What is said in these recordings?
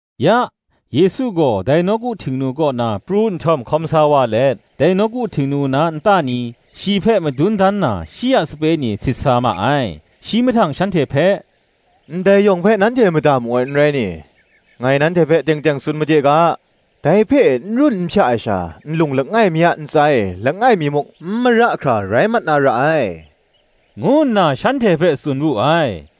Ya, Yesu gaw dai nawku Htingnu kaw na pru nhtawm hkawm sa wa let, dai nawku Htingnu na nta ni, shi hpe madun dan na, shi a sape ni sit sa ma ai. Shi mahtang shanhte hpe, Ndai yawng hpe nanhte mada mu ai, n rai ni? Ngai nanhte hpe teng teng tsun made ga, Dai hpe e n run n hpya ai sha nlung langai mi a ntsa e langai mi muk n mara hkra rai mat na ra ai, ngu nna shanhte hpe tsun wu ai.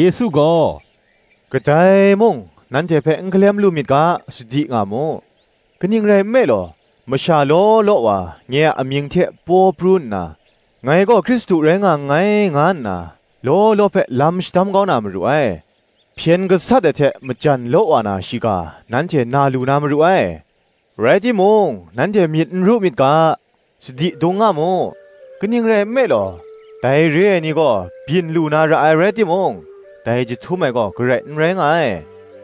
Yesu gaw, Kadai mung, nanhte hpe n hkalem lu myit ga, sadi nga mu. Kaning rai nme law, masha law law wa nye a amying hte paw pru nna, Ngai gaw Hkristu rai nga nngai, nga nna law law hpe lam shadam kau na maru ai. Hpyen gasat ai hte majan law wa na shiga nanhte na lu na maru ai; rai timung, nanhte myit n ru myit ga, sadi dung nga mu: kaning rai nme law, dai re ai ni gaw, byin lu na ra ai rai timung, dai jahtum ai gaw garai n rai nga ai.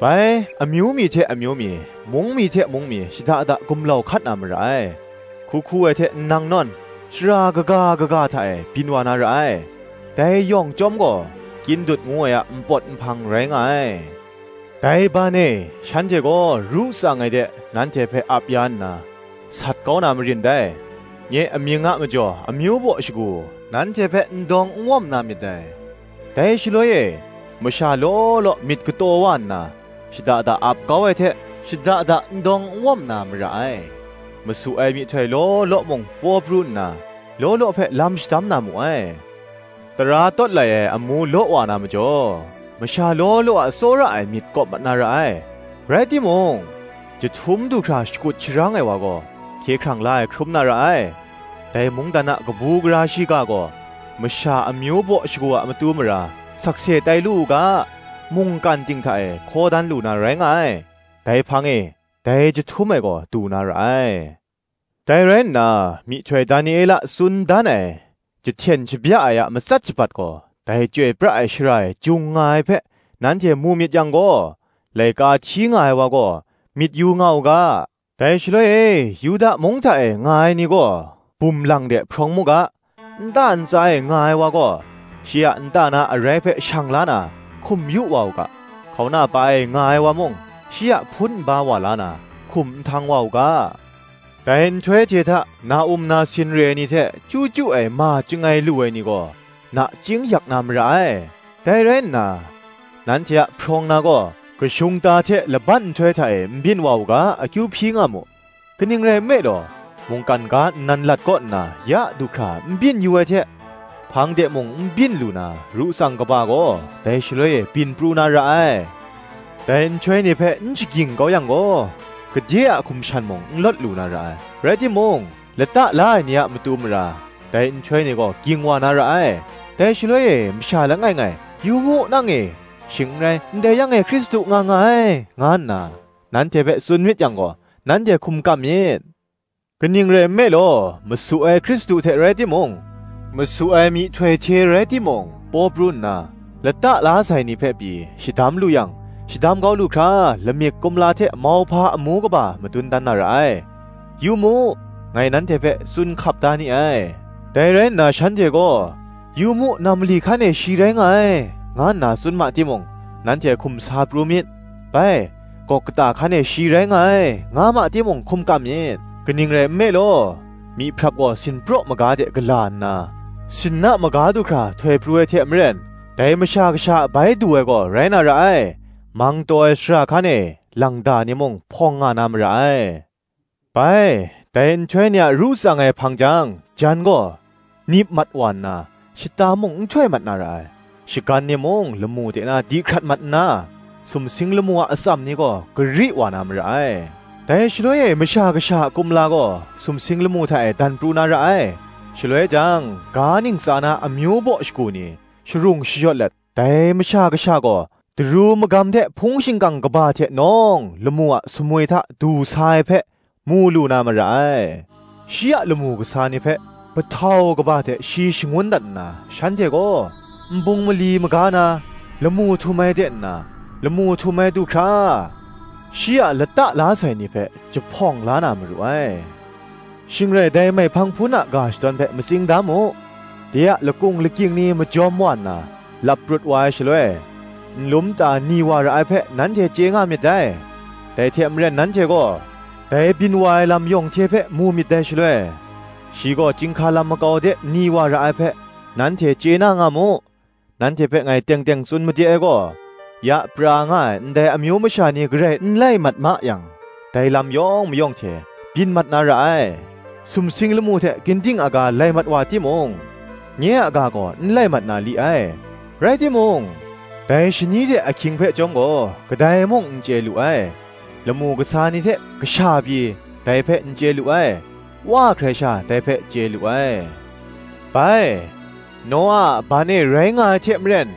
Bai, amyu mi hte amyu mi, mung mi hte mung mi shada da gumlau hkat na mara ai: hku hku ai hte nnang nawn, shara kaga kaga hta e byin wa na ra ai:. dai yawng chyawm gaw, kyin dut ngu ai a npawt nhpang rai nga ai. Dai ban e, shanhte gaw ru tsang ai de nanhte hpe ap ya nna, sat kau na marin dai; nye amying a majaw amyu baw shagu nanhte hpe n dawng n wawm na myit dai.. Dai shaloi e, masha law law myit kataw wa nna, shada da ap kau ai hte, shada da n dawng n wawm na mara ai. Masu ai myihtoi law law mung paw pru nna, law law hpe lam shadam na mu ai. Tara tawt lai ai amu law wa na majaw, masha law law a tsawra ai myit kawp mat na ra ai: rai timung, jahtum du hkra shakut sharang ai wa gaw, hkye hkrang la ai hkrum na ra ai.. Dai mungdan a kabu gara shiga gaw, masha amyu baw shagu a matu mara sakse tai lu u ga, mungkan ting hta e hkaw dan lu na rai nga ai; dai hpang e dai jahtum ai gaw du na ra ai. Dai rai nna, myihtoi Daniela tsun dan ai jahten shabya ai a matsat shabat gaw, dai chyoi pra ai shara e jung nga ai hpe nanhte mu myit yang gaw, laika hti nga ai wa gaw, myit yu nga u ga;. dai shaloi e Yuda mung hta e nga ai ni gaw, bum lang de hprawng mu ga; nta ntsa e nga ai wa gaw shi a nta na arai hpe shang la na, hkum yu wa u ga; hkauna pa e nga ai wa mung, shi a hpun nba wa la na, hkum nhtang wa u ga. Dai nhtoi hte hta na-um nasin re ai ni hte chyu chyu ai ma chyangai lu ai ni gaw, nachying yak na mara ai. Dai rai nna, nanhte a hprawng na gaw, kashung ta hte laban nhtoi hta e n byin wa u ga, akyu hpyi nga mu: kaning rai nme law, mungkan ga nnan lat kaw nna ya du hkra n byin yu ai hte hpang de mung n byin lu na ru tsang kaba gaw, dai shaloi e byin pru na ra ai.. Dai nhtoi ni hpe n shagying kau yang gaw, gade a hkum shan mung n lawt lu na ra ai; rai timung, lata la ai ni a matu mara, dai nhtoi ni gaw gying wa na ra ai. Dai shaloi e masha langai ngai, Yu mu, nang e, shing n rai, ndai yang e Hkristu nga nga ai, nga nna nanhte hpe tsun myit yang gaw, nanhte hkum kam myit. Kaning rai nme law, masu ai Hkristu hte rai timung, masu ai myihtoi hte rai timung paw pru nna, lata la sai ni hpe pyi shadam lu yang, shadam kau lu hkra lamik kumla hte mauhpa amu kaba madun dan na ra ai. Yu mu, ngai nanhte hpe tsun hkap da ni ai. Dai rai nna shanhte gaw, Yu mu, nam mali hkan e shi rai nga ai, nga nna tsun ma timung, nanhte hkum sa pru myit; bai gawk kata hkan e shi rai nga ai, nga ma timung, hkum kam myit. Kaning rai nme law, myihprap gaw sinpraw maga de gala nna, sinna maga du hkra htoi pru ai hte maren, dai Masha Kasha a bai du ai gaw rai na ra ai. Mang taw ai shara hkan e, lang da ni mung hpawng nga na mara ai. Bai, dai nhtoi ni a ru tsang ai hpang jang jan gaw nip mat wa nna, shata mung n htoi mat na ra ai; shagan ni mung, lamu de na di hkrat mat nna, sumsing lamu a atsam ni gaw gari wa na mara ai.. Dai shaloi e Masha Kasha a kumla gaw, sumsing lamu hta e dan pru na ra ai; shaloi jang ga ntsa na amyu baw shagu ni sharung shayawt let dai Masha Kasha gaw daru magam hte hpung shingkang kaba hte nawng lamu a sumwi hta du sa ai hpe, mu lu na mara ai.. Shi a lamu kasa ni hpe, pahtau kaba hte shi shangun dat nna, shanhte gaw nbung mali maga na, lamu htum ai de nna lamu htum ai du hkra, shi a lata la sai ni hpe jahpawng la na maru ai. Shing rai dai maihpang hpun a ga shadawn hpe matsing da mu: de a lakung lakying ni majawm wa nna, lap prut wa ai shaloi, nlum ta ni wa ra ai hpe nanhte chye nga myit dai. Dai hte maren nanhte gaw, dai byin wa ai lam yawng hte hpe mu myit dai shaloi, Shi gaw chyinghka lam makau de ni wa ra ai hpe, nanhte chye na nga mu. Nanhte hpe ngai teng teng tsun made ai gaw, Ya pra nga ai ndai amyu masha ni garai n lai mat ma yang, dai lam yawng mayawng hte byin mat na ra ai. Sumsing lamu hte ginding aga lai mat wa timung, nye a ga gaw n lai mat na li ai. Rai timung, dai shani hte ahkying hpe chyawm gaw kadai mung n chye lu ai: lamu kasa ni hte Kasha pyi, dai hpe n chye lu ai; Wa hkrai sha dai hpe chye lu ai. Bai, Noa a ban e rai nga ai hte maren,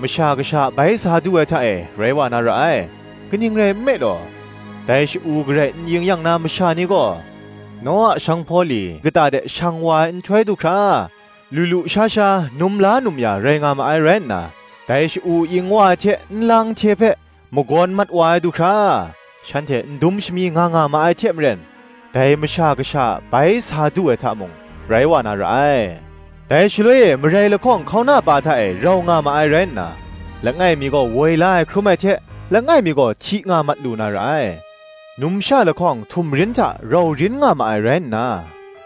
Masha Kasha a bai sa du ai hta e rai wa na ra ai. Kaning rai nme law, dai sha-u garai n ing yang na masha ni gaw Noa sanghpaw li kata de shang wa ai nhtoi du hkra, lu lu sha sha, num la num ya rai nga ma ai rai nna, dai sha-u ing wa ai hte nlang hte hpe magawn mat wa ai du hkra, shanhte n dum shami nga nga ma ai hte maren, dai Masha Kasha a bai sa du ai hta mung, rai wa na ra ai. Dai shaloi e marai lahkawng hkauna pa hta e rau nga ma ai rai nna, langai mi gaw woi la ai hkrum ai hte langai mi gaw hti nga mat lu na ra ai: numsha lahkawng htumrin hta rau rin nga ma ai rai nna,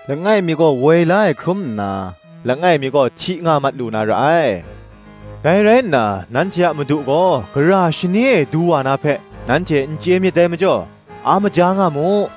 langai mi gaw woi la ai hkrum nna, langai mi gaw, hti nga mat lu na ra ai. Dai rai nna, nanhte a Madu gaw gara shani e du wa na hpe nanhte n chye myit dai majaw, a maja nga mu.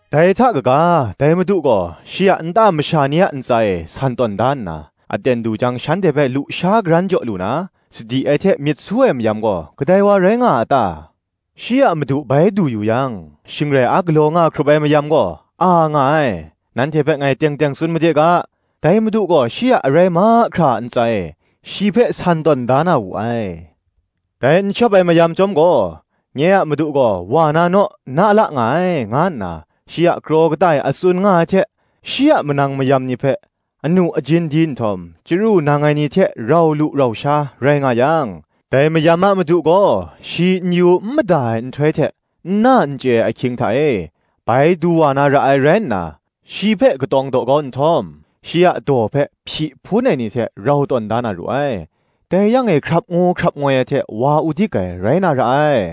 Dai hta kaga, dai Madu gaw shi a nta masha ni a ntsa e san tawn da nna aten du jang shanhte hpe lusha karan jaw lu na, sadi ai hte myit su ai mayam gaw kadai wa rai nga a ta? Shi a madu bai du yu yang, shing rai a galaw nga hkrup ai mayam gaw, a nga ai. Nanhte hpe ngai teng teng tsun made ga, Dai madu gaw shi a arai mahkra a ntsa e shi hpe san tawn da na wu ai. Dai n shawp ai mayam chyawm gaw, Nye a Madu gaw wa na naw na la nga ai, nga nna shi a kraw kata e a tsun nga ai hte, shi a manang mayam ni hpe anu ajin di nhtawm chyaru nang ai ni hte rau lu rau sha, rai nga yang, dai mayam a madu gaw, shi n yu n mada ai nhtoi hte, n na n chye ai ahkying hta e, bai du wa na ra ai rai nna, shi hpe katawng daw kau nhtawm, shi a daw hpe hpyi hpun ai ni hte rau tawn da na ru ai: dai yang e hkrap ngu hkrap ngoi ai hte wa udik ai rai na ra ai..